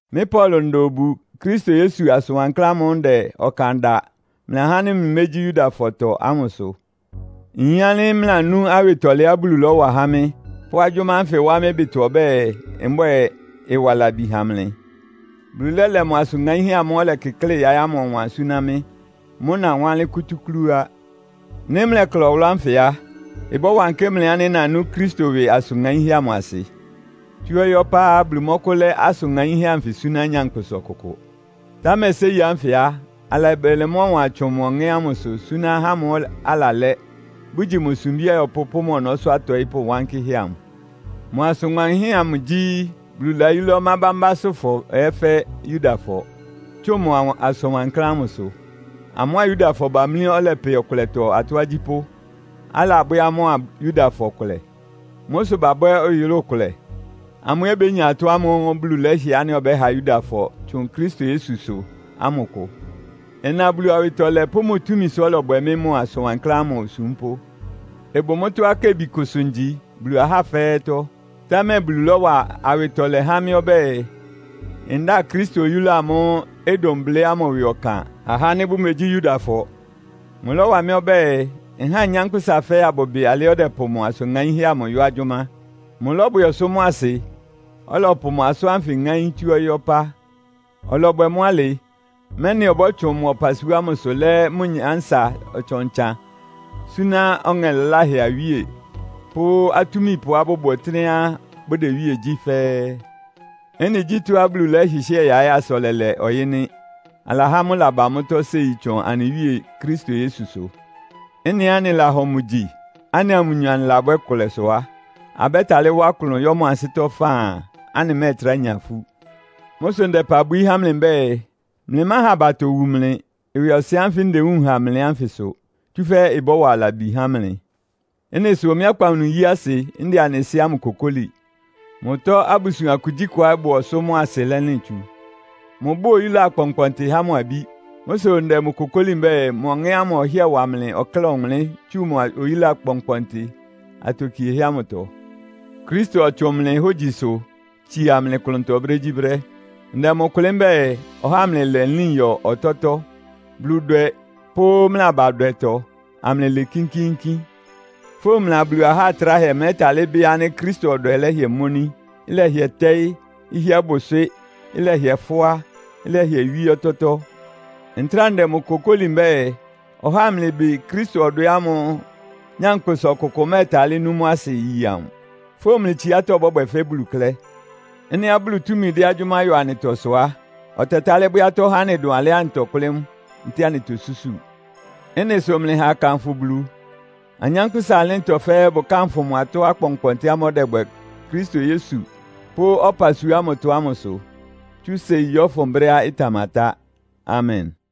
Mɩ́ Paulo nda obu Kristo Yesu asʋn wankláán ámʋ́ʋ́ ndɛ ɔkan da mlɩ ahá ánɩ́ mlɩmégyí Yudafɔtɔ ámʋ sʋ. Nyin ánɩ́ mlɩlanú awɩtɔlɛá Bulu lɔ́wa há mɩ́, pʋ́ agyʋ́má ánfɩ wá mɩ́ ɩbɩtɔ ɔbɛ́ɛ, mbwɛ́ɛ, ɩwa labi ha mlɩ. Bulu lɛ́lɛ mʋ asʋn ŋaínhɛ́ ámʋ́ʋ́ ɔlɛkɩklɩ́ yaɩ́ ámʋ ɔwan súná mɩ́. Mʋ́ nawánlɩ́n kútúklú á. Nɩ́ mlɛkla ɔwʋlʋ́ ánfɩ a, ɩbɔ́wankɩ́ mlɩ ánɩ́ nanú Kristo ɩwɩ asʋn ŋaínhɛ́ amʋ asɩ. Tsú ɔyɩ́ ɔpá á, Bulu mɔ́kʋ́lɛ́ asʋn ŋaínhɛ́ anfɩ súná nyankpʋsa ɔkʋkʋ. Támɛ séi ánfɩ á, alabɛlɛ mʋ́ ɔwan tsʋn mʋ Ɔŋɛ́ ámʋsʋ súná ahá ámʋ́ʋ́ alalɛ́, bʋgyi mʋ sumbí ayɔpʋ́ pʋ́ mʋ ɔnɔ́sʋ́ atɔɩ́pʋ́ wankɩ́hɛ́ amʋ. Mʋ asʋn ŋaínhɛ́ amʋ gyí, Bulu layúlá ɔmá bámbásʋ́fɔ ɛ́ fɛ́ Yudafɔ, tsʋn mʋ asʋn wankláán ámʋsʋ. Amʋ́a Yudafɔ bamlí ɔlɛpɛ ɔkʋlɛtɔ atɔ́ agyípʋ́, alabwɛ́ amʋ́a Yudafɔ kʋlɛ. Mʋ́ sʋ babwɛ́ ɔyʋlʋ́ʋ kʋlɛ. Amʋ́ ɛ́ bénya atɔ́ ámʋ́ʋ́ Bulu lɛ́hɩɛ ánɩ́ ɔbɛ́ha Yudafɔ tsʋn Kristo Yesusʋ ámʋ kʋ. Ɩna Bulu awɩtɔlɛ pʋ́ mʋ túmisʋ ɔ́lɔbwɛ mɩ́ mʋ asʋn wankláán ámʋ osúmpʋ́. Ɩbʋ mʋ́tɔ́á kebikʋsʋ ngyi Bulu ahá fɛ́ɛ́tɔ́. Támɛ Bulu lɔ́wa awɩtɔlɛ há mɩ́ ɔbɛ́ɛ, ndáa Kristo oyúla amʋ́ʋ́ ɩdʋn blɩ́ ámʋ ɩwɩ ɔkan ha ahá ánɩ́ bʋmegyí Yudafɔ. Mʋlɔ́wa mɩ́ ɔbɛ́ɛ, nháa anyánkpʋ́sa fɛ́ɛ́ abʋbɩ alɩá ɔdɛpʋ mʋ asʋn ŋaínhɛ́ amʋ yɔ́ agyʋ́má. Mʋlɔ́bwɛ ɔsʋ́ mʋ́a asɩ, ɔlɔpʋ mʋ asʋ́n ánfɩ ŋáín tsú ɔyɩ́ ɔpá. Ɔlɔbwɛ mʋ́ alɩ, mɛ́nɩ ɔbɔ́tsʋn mʋ ɔpasua ámʋsʋ lɛ́ mʋ nyánsa ɔtsan-ɔtsan súná ɔŋɛ laláhɛ awíe pʋ́ atúmipʋá bʋbʋ ɔtɩ́nɛ́á bʋdɛ iwíe gyí fɛ́ɛ́. Ɩ́nɩ gyí tɔ́á Bulu lɛ́hɩhɩ́ɛ yaɩ́ asa ɔlɛlɛ ɔyɩ́ nɩ́. Alahá mʋ́ ɩlaba mʋ́tɔ́ séi tsʋn anɩ Wíe Kristo Yesusʋ. Ɩ́nɩá anɩlahɔ mʋ gyi, anɩa mʋnyɔ anɩlabwɛ́ ɩkʋlɛ sʋ á, abɛ́talɩ́ wá klʋn yɔ́ mʋ ansɩ́tɔ́ faan, anɩmɛ́ɛtrá nya ifú. Mʋ́ sʋ ndɛ ɩpa bwií há mlɩ mbɛ́ɛ, mlɩmáha abatɔ iwu mlɩ, ɩwɩɔsɩn ánfɩ ndewúun ha mlɩ ánfɩ sʋ, tsúfɛ́ ɩbɔ́wa labi há mlɩ. Ɩ́nɩ sʋ mɩ́ akpawunu iyi asɩ, ndɛ anɩ Sɩ́ ámʋ kokóli. Mʋtɔ abusuan kugyíkʋá ɩbʋ ɔsʋ́ mʋ́a asɩ lɛlɩn tsu. Mʋbʋ́ʋ oyúla akpɔnkpɔntɩ há mʋ abí. Mʋ́ sʋ ndɛ mʋ kokóli mbɛ́ɛ, mʋ Ɔŋɛ́ ámʋ ɔhɩ́ɛ wa mlɩ ɔkláa ɔwʋnlɩ́n tsu mʋ oyúla kpɔnkpɔntɩ atokiehɛ́ ámʋtɔ, Kristo ɔtsʋn mlɩ hógyisʋ tsia mlɩ klʋntɔ brégyíbrɛ́. Ndɛ mʋ kʋlɩ́ mbɛ́ɛ, ɔhá amlɩlɛ nlín yɔ ɔtɔ́tɔ́, Buludwɛ pʋ́ mlɩ abadwɛtɔ, amlɩlɩɩ kínkíínkín. Fówun mlɩa Bulu ahá atráhɛ mlɛ́talɩ́ bɩ́ ánɩ́ Kristo ɔdwɛ lɛhɩɛ́ móní, ɩlɛhɩɛ tɛ́ɩ́, ɩhɩ́ɛ́ bʋ ɩswɩ́, ɩlɛhɩɛ fʋ́á, ɩlɛhɩɛ wíé ɔtɔ́tɔ́. Ntráa ndɛ mʋ kokóli mbɛ́ɛ, ɔhá amlɩbɩ Kristo ɔdwɛ ámʋ́ʋ́ nyankpʋsa ɔkʋkʋ mɛ́ɛtalɩ́ nú mʋ́ asɩ yi amʋ. Fówun mlɩ tsiátɔ́ bɔ́bwɛ fɛ́ Bulu klɛ́. Ɩ́nɩá Bulu túmi dɛ agyʋ́má yɔ anɩtɔ sʋ á, ɔtɛtálɩ́ bwɛ́ atɔ́ há anɩ dʋn alɩá anɩtɔkʋ́lɩ́ mʋ, ntɛ́ɛ anɩtosúsu. Ɩ́nɩ sʋ mlɩha akanfʋ Bulu. Anyánkpʋ́sa ɩlɩ́ntɔ fɛ́ɛ́ bʋkánfʋ mʋ atɔ́ akpɔnkpɔntɩ ámʋ́ʋ́ ɔdɛbwɛ Kristo Yesu pʋ́ ɔpasua ámʋtɔ ámʋ sʋ, tsú séi yɔ́fʋn brɛ́á ɩtamatá. Amen!